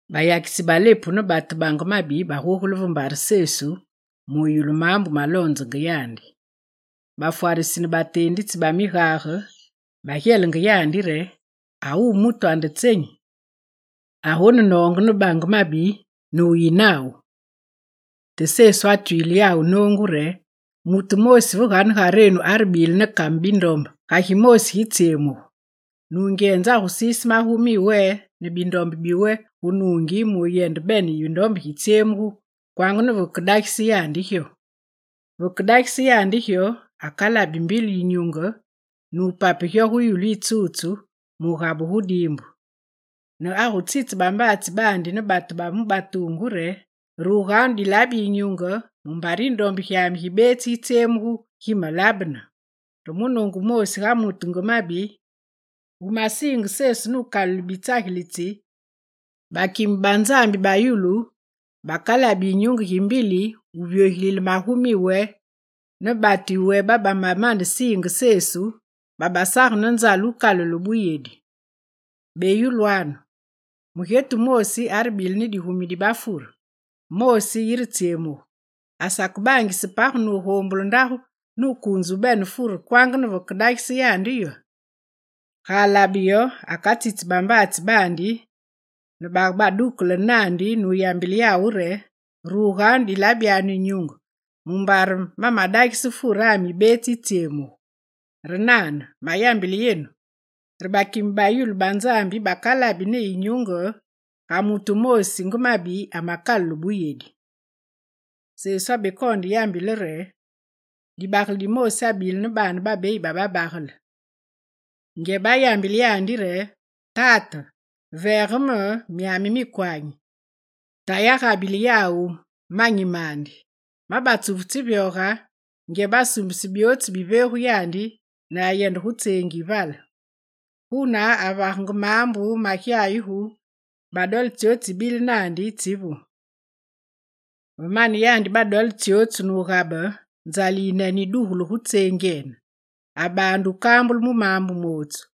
Bayakitsi ba lepu ne batu bange mabi bagogule ve mbare Sesu muyulu maambu maloonzenge yandi. Bafwarisi ne bateenditsi ba migage bagyelenge yandi re: «Awuwu mutu ande tsenyi agonenoonge ne batu bange mabi ne wuyi nawu!» Te Sesu atwile yawu noongu re: «Mutu wumoosi ve ganegarenu arebile ne kame bindombe, ga gimoosi gitsyemugu, nungyenze agusiise magumi yiwe ne bindombe yiwe gu nuungi muyende bene yindombe gitsetsyemugu kwanga ne vekedagise yandi gyo. Veke dagise yandi gyo akalabi mbili yinyunge ne wupape gyo gu yulu yitsutsu nugabugu gu diimbu. Ne agutsitse bambaatsi baandi ne batu ba mu batuungu re: “Ruganu dilabi yinyunge mumbare yindombe gyami gibetsi gitsyemugu gimalabene!” Re munoongu wumoàosi ga mutu nge mabi wumasiinge Sesu nukalule bitsagilitsi, bakime ba Nzambi ba yulu bakalabi yinyunge gimbili wuvyogilile magumi yiwe ne batu yiwe babamanesiinge Sesu, babasage ne nzale wukalule buyedi. Beyulwanu: mugyetu wumoosi arebile ne digumi di bafure, moosi yiretsyemugu, asakebaangise page nugombule ndagu nukuunze bene furene kwanga ne vakedagise yandi yo? Ga alabe yo, akatsitsi bambaatsi baandi ne babadukelene naandi nuyambile yawu re: “Ruganu dilabi yinyunge mumbare mamadagise furami yibetsi yitsyemugu!” Re nane, mayambile yenu re bakime ba yulu ba Nzambi bakabili ne yinyunge ga mutu wumoosi nge mabi amakalule buyedi.» Sesu abekoonde yambile re: «Dibagele dimoosi abile ne baane babeyi ba babagele. Ngyebe ayambile yandi re: “Tate, veege me myami mikwanyi. Tayi agabile yawu manyi mandi.” Ma batsufu tsivyoge, ngyebe asuumbise byootsu biveegu yandi ne ayende gu tseengi yi vale. Guna, avagenge maambu magyayugu ne badole tsyotsu tsibile naandi tsivu. Ve mane yandi badole tsyotsu nugabe, nzale yiyinene yidugulu gu tseengyene. Abaande wukambulu mu maambu mootsu.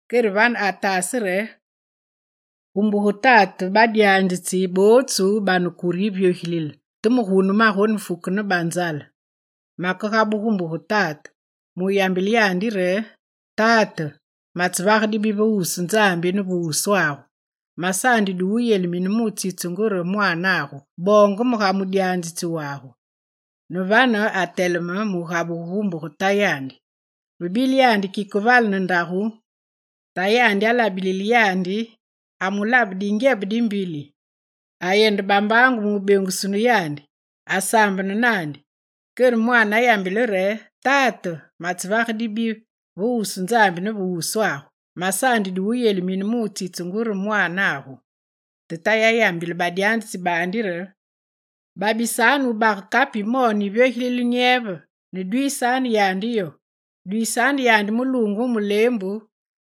Kere vane ataase re: “Gu mbuge tate badyanzitsi bootsu bane kure yivyogilile, te me gugu manafu ne banzale. Makegabugu gu mbuge tate muyambile yandi re: Tate, matsevage dibi ve wusu Nzambi ne ve wuswagu. Masaandi du wuyelimine mutsitsungu re mwaanagu. Boonge me ga mudyanzitsi wagu.” Ne vane, ateleme mugabugu gu mbuge tayandi. Ve bile yandi kike vale ne ndagu, tayandi alabilile yandi, amulabe dingyebe dimbili. Ayende bambaangu mubengusunu yandi. Asaambene naandi. Kere mwaane ayambile re: “Tate, matsevage dibi ve wusu Nzambi ne ve wuswagu. Masaandi du wuyelimine mutsitsungu re mwaanagu.” Te tayi ayambile badyanzitsi baandi re: “Babisanu wubage kape yimoone yivyogilile nyeve ne dwiisanu yandi yo. Dwiisanu yandi muluunge mu muleembu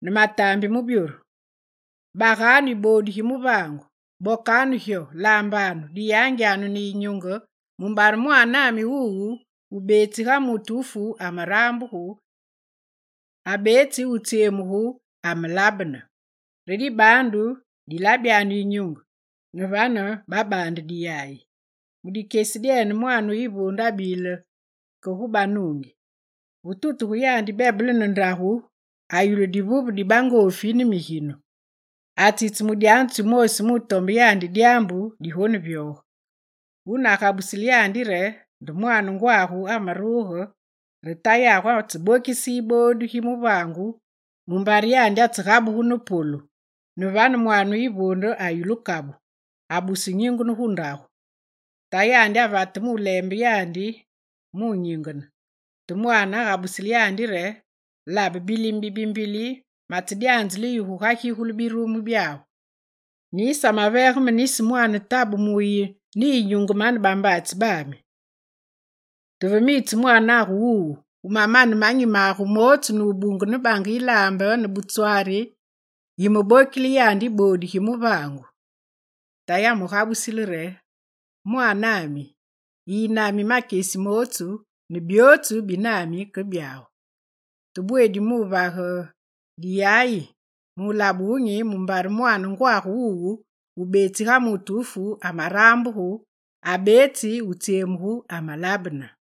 ne mataambi mu byoru. Baganu yiboodu gi muvaangu, bokanu gyo, laambanu, diyangyanu ne yinyunge, mumbare mwaanami wuwu wubetsi ga mutu wufu amarambugu, abetsi wutsyemugu, amalabene. Re dibaandu dilabyanu yinyunge.” Ne vane babaande diyaye. Mu dikyesi dyene mwaane wu yivuunde abile ke gu banuungi, ve tutuge yandi, bebele ne ndagu ayulu divuve di bangoofi ne miginu. Atsitse mudyanzitsi wumoosi mutombe yandi dyaambu digonevyoge. Wune agabusile yandi re: “Nde mwaane ngwagu amaruge re tayagu atsebokise yiboodu gi muvaangu mumbare yandi atsegabugu ne polu.” Ne vane, mwaane yivuunde ayulu kabu, abuse wunyingene gu ndagu. Tayandi avate muleembe yandi munyingene. Te mwaane agabusile tayandi re: “Labe bilime bibimbili matsedyanzile yu gugagigule Gigule: Digyere, mukalu, wubuse. birumu byagu, ne yisamaveege me nisi mwaane tabe mu wuyi ne yinyunge mane bambaatsi bami. Te ve miitse mwaanagu wuwu, wumane manyi magu mootsu nubunge ne bange yilaambe ne butswari, yimebokisile yandi yiboodu gi muvaangu!” Tayi amugabusile re: “Mwaanami, yiyi nami makyesi mootsu ne byootsu bi nami ke byagu. Te bweedi muvage diyayi, mulabe wunyi mumbare mwaane ngwagu wuwu wubetsi ga mutu wufu amarambugu, abetsi wutsyemugu amalabene!”»